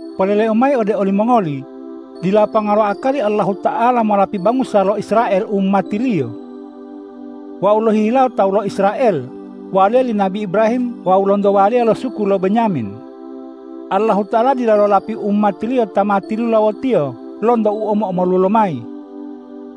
Poleleu mayi ode olimongoli: Dila ponga lo akali Allahuta'ala molapi bangusa lo Israel umati-Liyo. Wau lohihilawo tawu lo Israel, waliya li nabi Ibrahim wawu lonto waliya lo suku lo Benyamin. Allahuta'ala dila lolapi umati-Liyo ta ma tilulawo-Tiyo lonto u omo-omolu lomayi.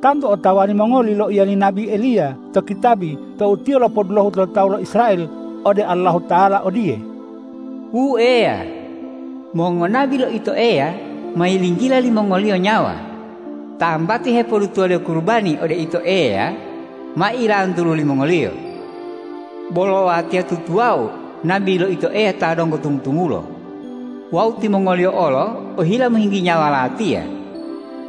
Tantu otawa limongoli loiya li nabi Eliya to kitabi tou tiyo lopodulohu lo tawu lo Israel ode Allahuta'ala odiye, ”Wu Eya, mongonabi lo Ito Eya ma yilinggila limongoliyo nyawa, tambati hepodutuwaliyo kurubani ode Ito Eya ma ilantulu limongoliyo, bolo watiya tutuwawu nabi lo Ito Eya ta donggo tumu-tumulo wawu timongoliyo olo ohila mohinggi nyawa latiya.”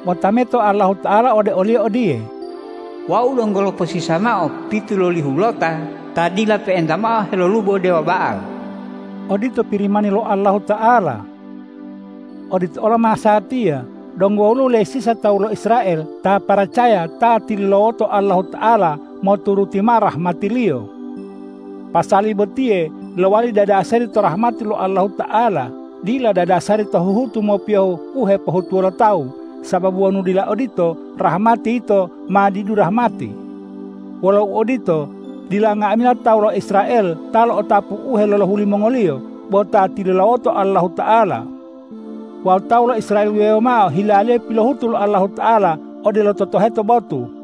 Bo tameto Allahuta'ala ode oliyo odiye,”Wau donggo loposisa mao pitulolihulota ta dila pe'enta mao helolubo dewa Ba'al.” Odito Pirimani lo Allahuta'ala. Odito olo masatiya, donggo woluwo lesisa tawu lo Israel ta paracaya ta tilulawoto Allahuta'ala moturuti mao rahmati-Liyo. Pasali botiye lowali dadasari to rahmati lo Allahuta'ala, dila dadasari to huhutu mopiyohu u hepohutuwo lo tawu, sababu wonu dila odito, rahmati yito ma didu rahmati. Wolo uodito, dila nga'amila tawu lo Israel ta lo'otapu u helolohu limongoliyo bo ta tilulawoto Allahuta'ala. Wawu tawu lo Israel wuwewo mao hilaliyo pilohutu lo Allahuta'ala odelo totoheto botu.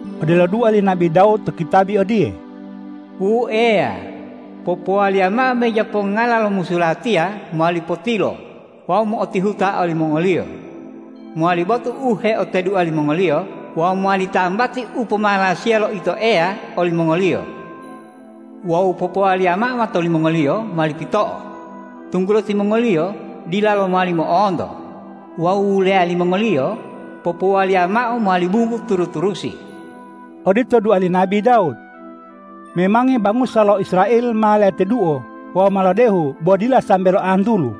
Odelo dua li nabi Dawud to kitabi odiye,”Wu Eya, popowaliya mao meja pongongala lo musu latiya mowali potilo wawu mo'otihuta olimongoliyo, mowali botu u heotedua limongoliyo wawu mowali tambati u pomalasiya lo Ito Eya olimongoliyo! Wawu popowaliya mao mato limongoliyo mowali pito'o, tunggulo timongoliyo dilalo mowali mo'onto wawu wuleya limongoliyo popowaliya mao mowali bunggu turu-turusi.” Odito dua li nabi Dawud. Memangi bangusa lo Israel ma leteduo wawu ma lodehu bo dila sambe loantulu.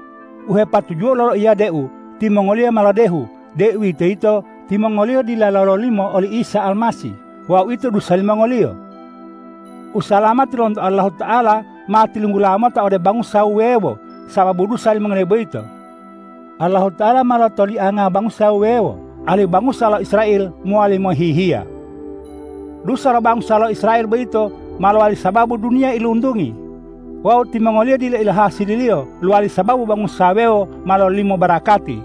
U hepatujuwou loloiya deu timongoliyo ma lodehu, deuwitoyito timongoliyo dila lololimo oli Isa Almasih wawu uwito dusa limongoliyo. Usalamati lonto Allahuta'ala ma tilunggula mota ode bangusa wuwewo sababu dusa limongoliyo boyito. Allahuta'ala ma lotolianga bangusa wuwewo, alihu bangusa lo Israel mowali mohihiya. Dusa lo bangusa lo Israel boyito ma lowali sababu duniya iluntungi. Wawu timongoliyo dila ilohasililiyo lowali sababu bangusa wuwewo ma lololimo barakati.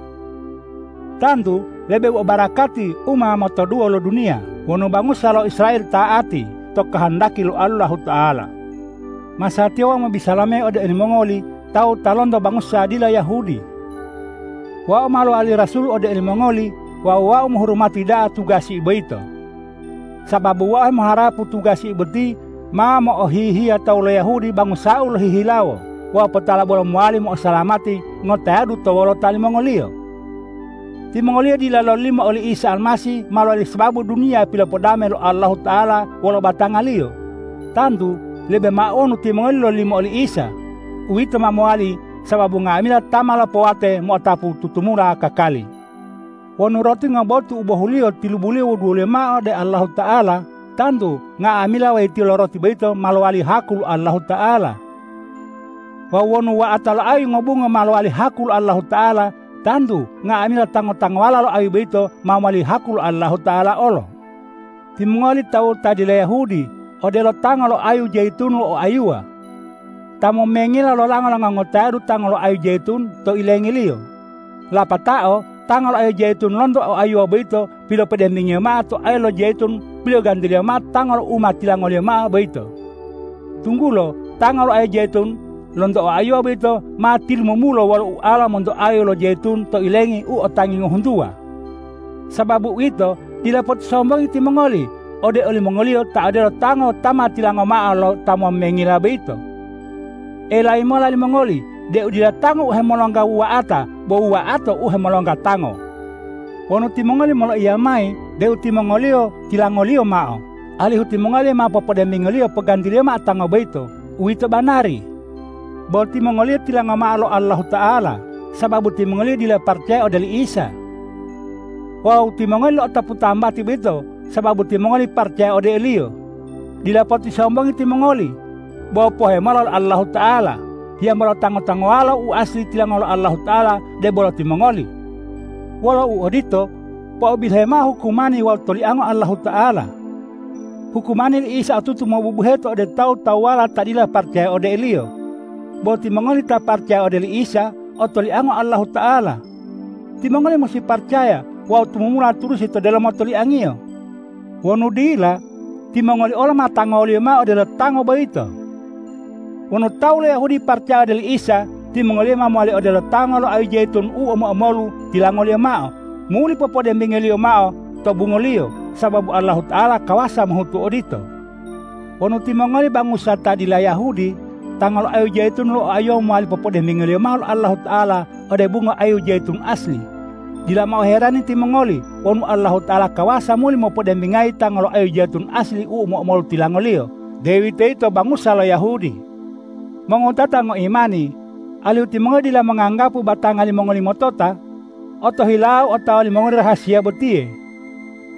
Tantu lebe mao barakati u ma motoduwo lo duniya wonu bangusa lo Israel ta'ati to kohondaki lo Allahuta'ala. Masatiya wau mobisala mayi ode olimongoli tawu ta lonto bangusa dila Yahudi. Wau ma lowali rasul ode olimongoli wawu wau mohurumati da'a tugasiu boyito. Sababu wau hemoharapu tugasiu boti ma mo'ohihiya to tawu lo Yahudi bangusau lohihilawo wawu potala bolo mowali mo'osalamati ngotayadu to wolota limongoliyo. Timongoliyo dila lololimo oli Isa Almasih ma lowali sababu duniya pilopodame lo Allahuta'ala wolo batanga-Liyo. Tantu lebe mao wonu timongoliyo lololimo oli Isa. Uwito ma mowali sababu nga'amila ta ma lopowate mo'otapu tutumula kakali. Wonu roti ngobotu u bohuliyo tilubuliyo wuduwo mola ode Allahuta'ala, tantu nga'amila wayitiyo lo roti boyito ma mowali haku lo Allahuta'ala. Wawu wonu wuwa'ata lo ayu ngobungo ma lowali haku lo Allahuta'ala, tantu nga'amila tango-tangowala lo ayu boyito ma mowali haku lo Allahuta'ala olo. Timongoli tawu ta dila Yahudi odelo tango lo ayu jayitun lo oayuwa. Ta momengila lolango-lango ngotayadu tango lo ayu jayitun to ilengiliyo. Lapatao tango lo ayu jayitun lonto oayuwa boyito pilopodembingiyo mao to ayu lo jayitun pilogantiliyo mao tango u ma tilangoliyo mao boyito, tunggulo tango lo ayu jayitun lonto oayuwa boyito ma tilumumulo wolo ualo monto ayu lo jayitun to ilengi u o tangi ngohuntuwa. Sababu uwito, dila potisombongi timongoli ode olimongoliyo ta odelo tango ta ma tilango mao lo ta momengila boyito. Elayi mola limongoli deu dila tango u hemolongga wuwa'ata, bo wuwa'ata u hemolongga tango. Wonu timongoli moloiya mayi deu timongoliyo tilangoliyo mao, alihu timongoli ma popodembingoliyo pogantiliyo mao tango boyito, uwito banari. Bo timongoliyo tilango mao lo Allahuta'ala sababu timongoliyo dila paracaya ode oli Isa. Wawu timongoli lo'otapu tambati boyito sababu timongoli paracaya ode o-Liyo. Dila potisombongi timongoli, bo pohe mola lo Allahuta'ala. Hiyambola tango-tangowala u asli tilango lo Allahuta'ala, debolo bo timongoli. Wolo uodito, po'obilohe mao hukumani wawu toliango Allahuta'ala. Hukmani li Isa otutu mobubuheto ode tawu-tawuwala ta dila paracaya ode o-Liyo. Bo timongoli ta paracaya ode oli Isa otoliango Allahuta'ala. Timongoli musi paracaya wawu tumumula turusi to delomo toliang-Iyo. Wonu dila, timongoli olo ma tangoliyo mao odelo tango boyito. Wonu tawu lo Yahudi paracaya ode oli Isa, timongoliyo ma mowali odelo tango lo ayu jayitun u omo-omolu tilangoliyo mao, muli popodembingoliyo mao to bungoliyo, sababu Allahuta'ala kawasa mohutu odito. Wonu timongoli bangusa ta dila Yahudi, tango lo ayu jayitun lo oayuwa mowali popodembingoliyo mao lo Allahuta'ala ode bungo ayu jayitun asli, dila mao oherani timongoli wonu Allahuta'ala kawasa muli mopodembingayi tango lo ayu jayitun asli u omo-omolu tilangoliyo, deuwitoyito bangusa lo Yahudi. Mongowutata ngoimani, alihu timongoli dila monganggapu batanga limongoli motota, otohilau otawa limongoli rahasiya botiye.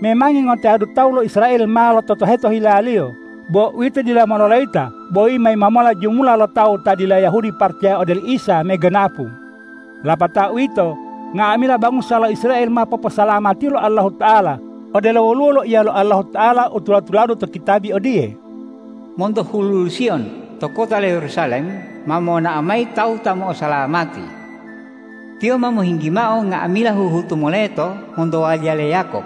Memangi ngotayadu tawu lo Israel ma lototoheto hilaliyo. Bo uwito dila mololayita bo yima-yima mola jumula lo tawu ta dila Yahudi paracaya ode oli Isa meganapu. Lapato uwito, nga'amila bangusa lo Israel ma poposalamatiyo lo Allahuta'ala. Odelo woluwo loiya lo Allahuta'ala u tula-tuladu to kitabi odiye,”Monto huludu Siyon to kota lo Yerusalem ma monao mayi tawu ta mo'osalamati. Tiyo ma mohinggi mao nga'amila huhutu moleto monto waliya le Yakob.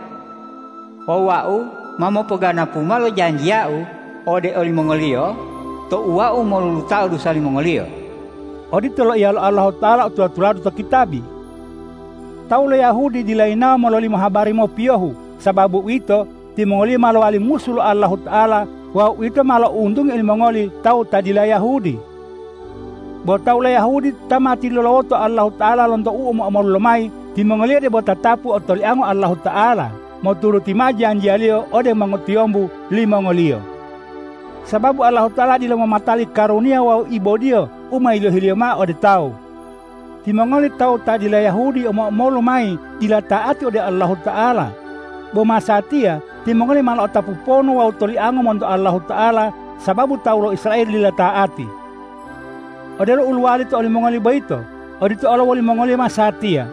Wawu Wau ma mopoganapu mao lo janjiya-U ode olimongoliyo tou Wau molulutao dusa limongoliyo.” Odito loiya lo Allahuta'ala u tula-tulade to kitabi. Tawu lo Yahudi dila yinawo mololimo habari mopiyohu. Sababu uwito, timongoliyo ma lowali musu lo Allahuta'ala wawu uwito ma lo'ountungi olimongoli tawu ta dila Yahudi. Bo tawu lo Yahudi ta ma tilulawoto Allahuta'ala lonto u omo-omolu lomayi, timongoliyo debo tatapu otoliango Allahuta'ala moturuti mao janjiya-Liyo ode mongotiyombu limongoliyo. Sababu Allahuta'ala dila momatali karuniya wawu ibodiyo u ma yilohi-Liyo mao ode tawu. Timongoli tawu ta dila Yahudi omo-omolu mayi dila ta'ati ode Allahuta'ala. Bo masatiya timongoli ma lo'otapu ponu wawu tolianga monto Allahuta'ala, sababu tawu lo Israel dila ta'ati. Odelo u lowali to olimongoli boyito, odito olo wolimongoliyo masatiya: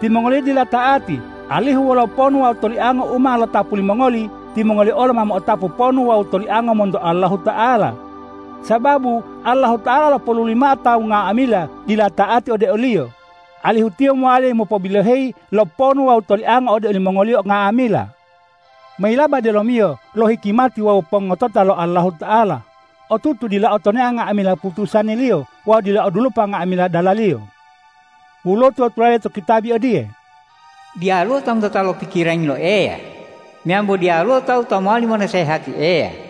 Timongoliyo dila ta'ati, alihu wolo ponu wawu tolianga u ma lotapu limongoli, timongoliyo olo ma mo'otapu ponu wawu tolianga monto Allahuta'ala. Sababu Allahuta'ala lopoluli mao tawu nga'amila dila ta'ati ode o-Liyo, alihu Tiyo mowali mopobiloheyi lo ponu wawu toliango ode olimongoliyo nga'amila. Mayilaba delomiyo lo hikimati wawu pongotota lo Allahuta'ala, otutu dila otonea nga'amila putusani-Liyo wawu dila odulopa nga'amila dala-Liyo! Woluwo tula-tulade to kitabi odiye,”Diyaluwo ta motota lo pikirangi lo Eya meyambo diyaluwo tawu ta mowali monasehati Eya.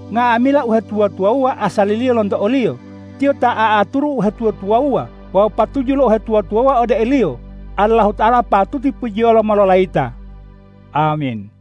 Nga'amila uhetuwa-tuwawuwa asaliliyo lonto o-Liyo, Tiyo ta a'aturu uhetuwa-tuwawuwa wawu patuju lo uhetuwa-tuwawuwa ode o-Liyo. Allahuta'ala patuti pujiyolo mololayita! Amin.